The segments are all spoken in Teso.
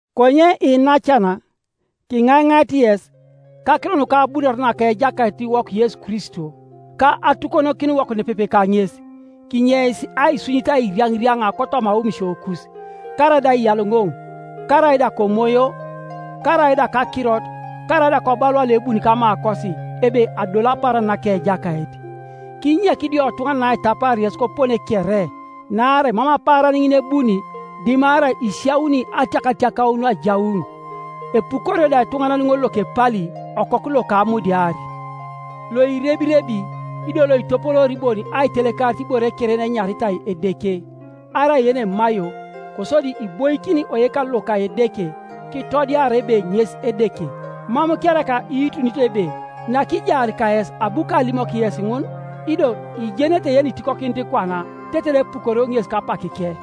Konye iinacan, kiŋaiŋait yes, kakiro nuka abunore naka Ejakaitiwok Yesu Kristo, ka atukonokiniwok nepepe kaŋes, kinyeis aisunyit airiaŋiriaŋa kotoma aomisiokus, karaida aiyaloŋoŋ, karaida komoyo, karaida kakirot, karaida kobalua loebuni kamakosi, ebe adolu apaaran naka Ejakait. Kinyek idiotuŋanan aitapaar yes kopone kere; naarai mam apaaran ŋin ebuni, dimarai isiauni atiakatiakaun ajaun, epukorio da etuŋanan ŋol lokepali, okoku loka amudiar, loirebirebi, ido loitopoloor bon aitelekarit ibore kere yenenyaritai edeke, arai yenemaio; kosodi iboikin oyekalu loka Edeke, kitodiara ebe ŋes Edeke. Mam kereka iitunito ebe nakijaar kayes abu kalimok yes ŋun? Ido ijenete yenitikokinit kwana, tetere epukorio ŋes kapakike.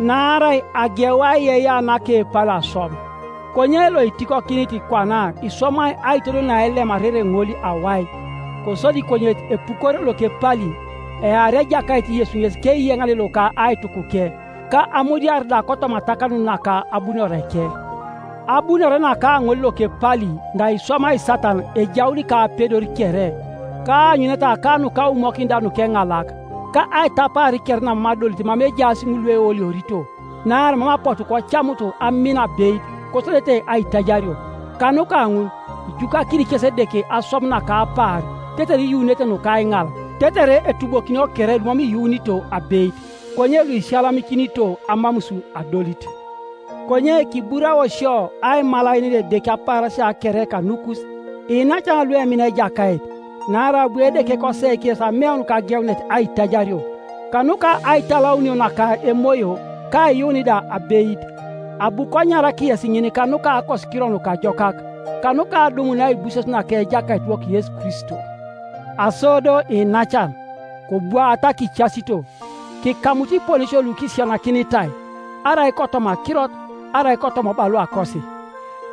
Naarai ageu aiyeiyea naka epali aswam; konye loitikokinit kwana iswamai aitodol naelemarere ŋol awai. Kosodi konyet epukorio lokepali, eari Ejakait Yesu ŋes keiyeŋane loka aitukuke, ka amudiar da kotoma atakanun naka abunoreke. Abunore naka ŋol lokepali naiswamai Satan ejaun kapedor kere, kaanyuneta ka nukaumokin da nukeŋalak, ka aitapaar kere namam adolit mama ejaas ŋul lueoliorito, naarai mam apotu kocamut amin abeit, kosodete aitajario. Kanuka ŋun ijukakini kes Edeke aswam naka apaar, tetere iyunete nuka aiŋal, tetere etubokinio kere lumam iyuunito abeit, konye luisiyalamikinito amamus adolit. Konye kiburao sio aimalaenen Edeke apaarasia kere kanukus, iinacan luemina Ejakait, naarai abu Edeke koseik yes ameun kageunet aitajario, kanuka aitalaunio naka Emoyo, ka aiyuun da abeit. Abu konyarak yes ŋin kanuka Akosikiro Nukajokak, kanuka adumun aibuses naka Ejakaitiwok Yesu Kristo. Aso do iinacan, kobwaata kicasito, kikamut iponesio lukisisianakinitai, arai kotoma akirot, arai kotoma obaluakosi.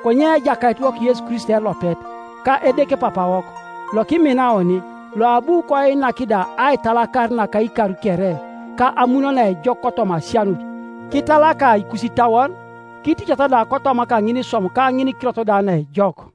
Konye Ejakaitiwok Yesu Kristo elopet, ka Edeke Papawok, lokimina oni, loabu koinak da aitalakar naka ikar kere, ka amun naejok kotoma asianut, kitalaka ikusitauon, kiticat da kotoma kaŋiniswam ka ŋinikirot da naejok.